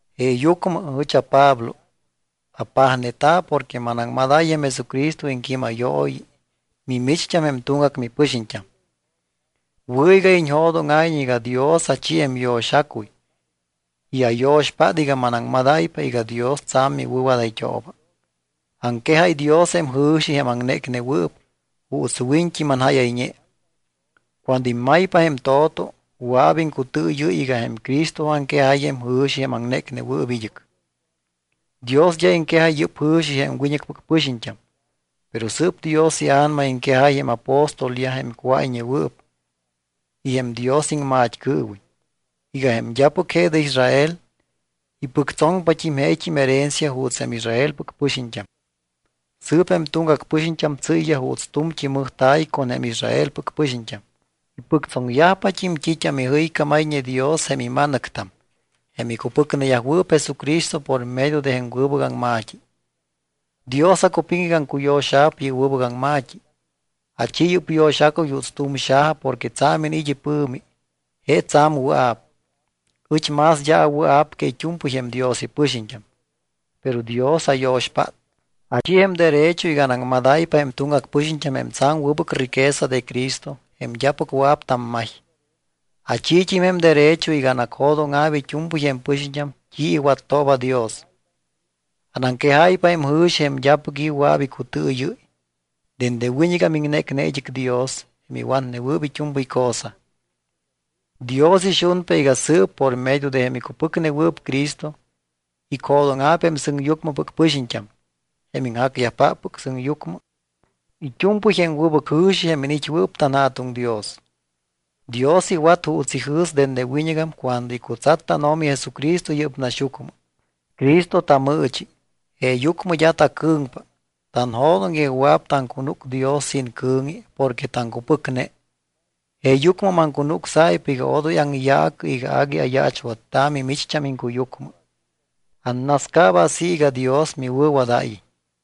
Jeeyucmɨ ɨch aPablo apajneta̱ porque manaŋmadáy jém Jesucristo iŋquímayooyi mimicht́am jém tuŋgac mipɨxiñt́am. Wɨ̱ iga iñjo̱dóŋa̱iñ iga Dios achi jém yo̱xacuy y ayo̱xpát iga manaŋmadáypa iga Dios tsa̱m miwɨ̱wadayt́ooba. Aŋquejáy Dios jém jɨ̱xi, jém aŋnécnewɨɨp, juuts wiñt́i manjáyayñe. Cuando immaypa jém to̱to, wɨa̱p iŋcutɨɨyɨ́y iga jém Cristo aŋquejáy jém jɨ̱xi, jém aŋnécnewɨɨp id́ɨc. Dios d́a iŋquejáy yɨ́p jɨ̱xi jém wiñɨcpɨc pɨxiñt́am. Pero sɨɨp Dios iA̱nama iŋquejáy jém apóstolyaj, jém cuáyñewɨɨp, y jém Dios iŋmat́cɨɨwiñ iga jém d́apɨc je de Israel ipɨctsoŋpat́im jeet́im herencia juuts jém Israelpɨc pɨxiñt́am. Sɨɨp jém tuŋgac pɨxiñt́am tsɨ́yyaj juuts tu̱mt́i mɨjta̱y con jém Israelpɨc pɨxiñt́am. Ipɨctsoŋyajpat́im t́it́am ijɨycámayñe Dios jém ima̱nɨctam, jém icupɨcneyajwɨɨp Jesucristo por medio de jém wɨbɨc aŋma̱t́i. Dios acupiŋ iga aŋcuyo̱xa̱p yɨ́p wɨbɨc aŋma̱t́i. Achi yɨ́p yo̱xacuy juuts tu̱m xaja porque tsa̱m iniit́ ipɨ̱mi, je tsa̱m wɨa̱p. Ɨch más d́a awɨa̱p que it́u̱mpɨy jém Dios ipɨxiñt́am, pero Dios ayo̱xpát, achi jém derecho iga anaŋmadáypa jém tuŋgac pɨxiñt́am jém tsa̱m wɨbɨc riqueza de Cristo jém d́apɨc wɨa̱p tammay. Achiit́im jém derecho iga anacjo̱dóŋa̱p it́u̱mpɨy jém pɨxiñt́am t́i iwattooba Dios. Anaŋquejáypa jém jɨ̱xi jém d́apɨc i̱ wɨa̱p icutɨɨyɨ́y, dende wiñɨgam iŋnécne id́ɨc Dios, jém iwatnewɨɨp it́u̱mpɨy cosa. Dios ixunpa iga sɨɨp por medio de jém icupɨcnewɨɨp Cristo icjo̱dóŋa̱p jém sɨŋyucmɨpɨc pɨxiñt́am, jém iŋjacyajpáppɨc sɨŋyucmɨ, it́u̱mpɨy jém wɨbɨc jɨ̱xi jém iniit́wɨɨp tanJa̱tuŋ Dios. Dios iwat juuts ijɨ̱s dende wiñɨgam cuando icutsat tánO̱mi Jesucristo yɨ́p naxyucmɨ. Cristo tamɨɨchi, jeeyucmɨ d́a tacɨ̱ŋpa, tanjo̱doŋ iga wɨa̱p taŋcunúc Dios sin cɨ̱ŋi porque taŋcupɨcne. Jeeyucmɨ maŋcunucsáypa iga odoy aŋyaacɨ iga agui ayaachwatta̱ mimicht́am iŋcuyucmɨ. Annascaaba así iga Dios miwɨ̱wadáyiñ.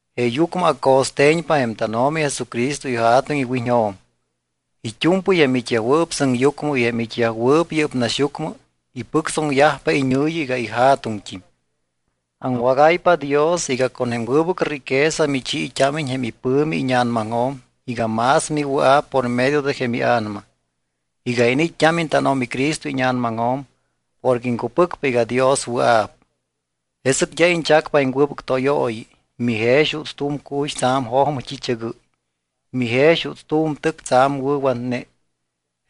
Jeeyucmɨ aco̱ste̱ñpa jém tánO̱mi Jesucristo iJa̱tuŋ iwiñjo̱m. It́u̱mpɨy jém it́yajwɨɨp sɨŋyucmɨ y jém it́yajwɨɨp yɨ́p naxyucmɨ ipɨctsóŋayyajpa iñɨ̱yi iga iJa̱tuŋt́im. Aŋwágáypa Dios iga con jém wɨbɨc riqueza michiit́ámiñ jém ipɨ̱mi íña̱namaŋjo̱m iga más miwɨa̱p por medio de jém iA̱nama iga iniit́t́ámiñ tánO̱mi Cristo íña̱namaŋjo̱m porque iŋcupɨcpa iga Dios wɨa̱p. Jesɨc d́a iñchacpa jém wɨbɨc tóyooyi. Mijex juuts tu̱m cuy tsa̱m jojmɨ t́i̱chɨgɨ́y. Mijex juuts tu̱m tɨc tsa̱m wɨ̱watne.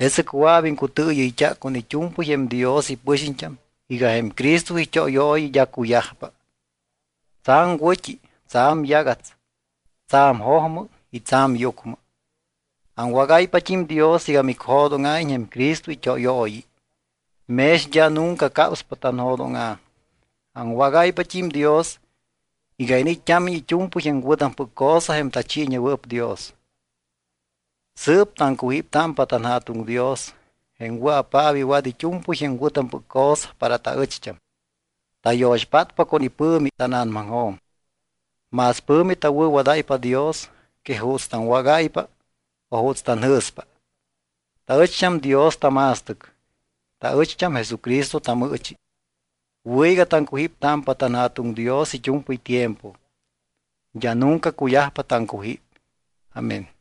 Jesɨc wɨa̱p iŋcutɨɨyɨyt́a con it́u̱mpɨy jém Dios ipɨxiñt́am iga jém Cristo it́óyooyi d́a cuyajpa, tsa̱m wɨ̱t́i, tsa̱m yagats, tsa̱m jojmɨ y tsa̱m yucmɨ. Aŋwágáypat́im Dios iga micjo̱dóŋa̱iñ jém Cristo it́óyooyi, mex d́a nunca capspa tanjo̱dóŋa̱. Aŋwágáypat́im Dios iga iniit́t́ámiñ it́u̱mpɨy jém wɨ̱tampɨc cosa jém tachiiñewɨɨp Dios. Sɨɨp taŋcujíptámpa tanJa̱tuŋ Dios jém wɨa̱paap iwat it́u̱mpɨy jém wɨ̱tampɨc cosa para taɨcht́am. Tayo̱xpátpa con ipɨ̱mi tána̱namaŋjo̱m. Más pɨ̱mi tawɨ̱wadáypa Dios que juuts taŋwágáypa o juuts tanjɨ̱spa. Taɨcht́am Dios tama̱stɨc. Taɨcht́am Jesucristo tamɨɨchi. Wɨ̱ iga taŋcujíptámpa tanJa̱tuŋ Dios it́u̱mpɨy tiempo, d́a nunca cuyajpa taŋcujíp. Amén.